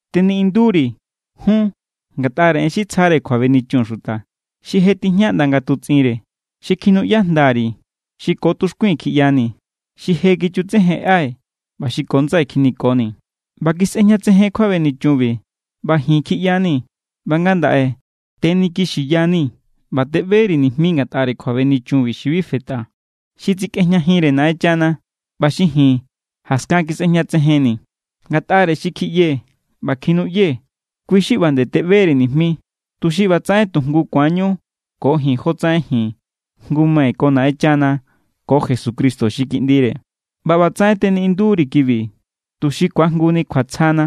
Teniꞌindu=ri̱ jun ngatꞌare en xi tsjare kjuabenichun xuta, xi je tijña ꞌnda ngatutsꞌinre, xi kjinuꞌya jnda_ri̱, xi ko tuxkui̱n kjiꞌyanii̱, xi je kichutsejenꞌai̱ ꞌba xi ko ndsai̱ kjinikonii̱. ꞌBa kisꞌejñatsejen kjuabenichunbi, ꞌba ji̱n kjiꞌyanii̱. ꞌBa ngandaꞌe tenikixiyanii̱ ꞌba teꞌberi̱ nijmi ngatꞌare kjuabenichunbi xi bi fetꞌa, xi tsikꞌejñajinre Naꞌenchana ꞌba xi ji̱n jaskan kisꞌejñatsejenni̱. Ngatꞌare xi kjiꞌyee̱ ꞌba kjinuꞌyee̱, kui xi ꞌba nde teꞌberi̱ nijmi, tuxi ꞌbatsaꞌen tu jngu ku̱anñu ko ji̱n jotsaꞌen ji̱n jngu= mai̱ ko Naꞌenchana ko Jesucristo xi Kiꞌndire. ꞌBa ꞌbatsaꞌen teniꞌindu=ri̱ kibi tuxi ku̱ajnguni kjuatsjana.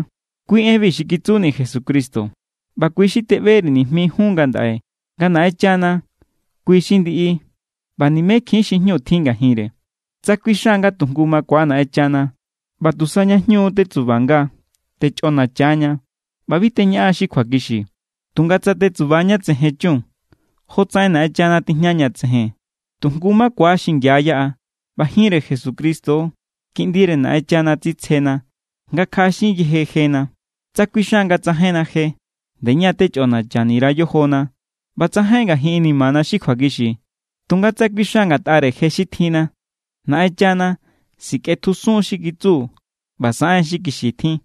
Kui enbi xi kitsuni̱ Jesucristo, ꞌba kui xi teꞌberi̱ nijmi jun ngandaꞌe nga Naꞌenchana kui xi ndiꞌi ꞌba nimekjiín xi jñu tjin ngajinre. Tsa kuixan nga tu jngu makua Naꞌenchana ꞌba tusa ña jñu tetsubanga, techꞌonacha=ña ꞌba bi teñaꞌan xi kjuakixi. Tunga tsa tetsuba ña tsejen chun jotsaꞌen Naꞌenchana tijña ña tsejen, tu jngu makua xingia yaꞌa ꞌba jinre Jesucristo, Kiꞌndire Naꞌenchana, tsitsjena nga kjaꞌaxin yeje jena. Tsa kuixan nga tsajainna je, nde ña= techꞌonachani_ra yojona ꞌba tsajain ngajin inimana xi kjuakixi. Tunga tsa kuixan ngatꞌare je xi tjinna, Naꞌenchana sikꞌetjusun= xi kitsu ꞌba saꞌen= xi kixi tjin.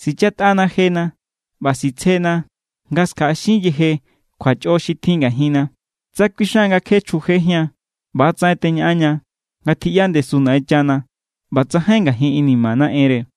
Sichatꞌana jena ꞌba sitsjena nga skjaꞌaxin yeje kjuachꞌo xi tjin ngajinna. Tsa kuixan nga kje chjujejían, ꞌba=tsaꞌen teñaꞌanña nga tjiꞌya ndesu Naꞌenchana ꞌba tsajain ngajin inimana enre.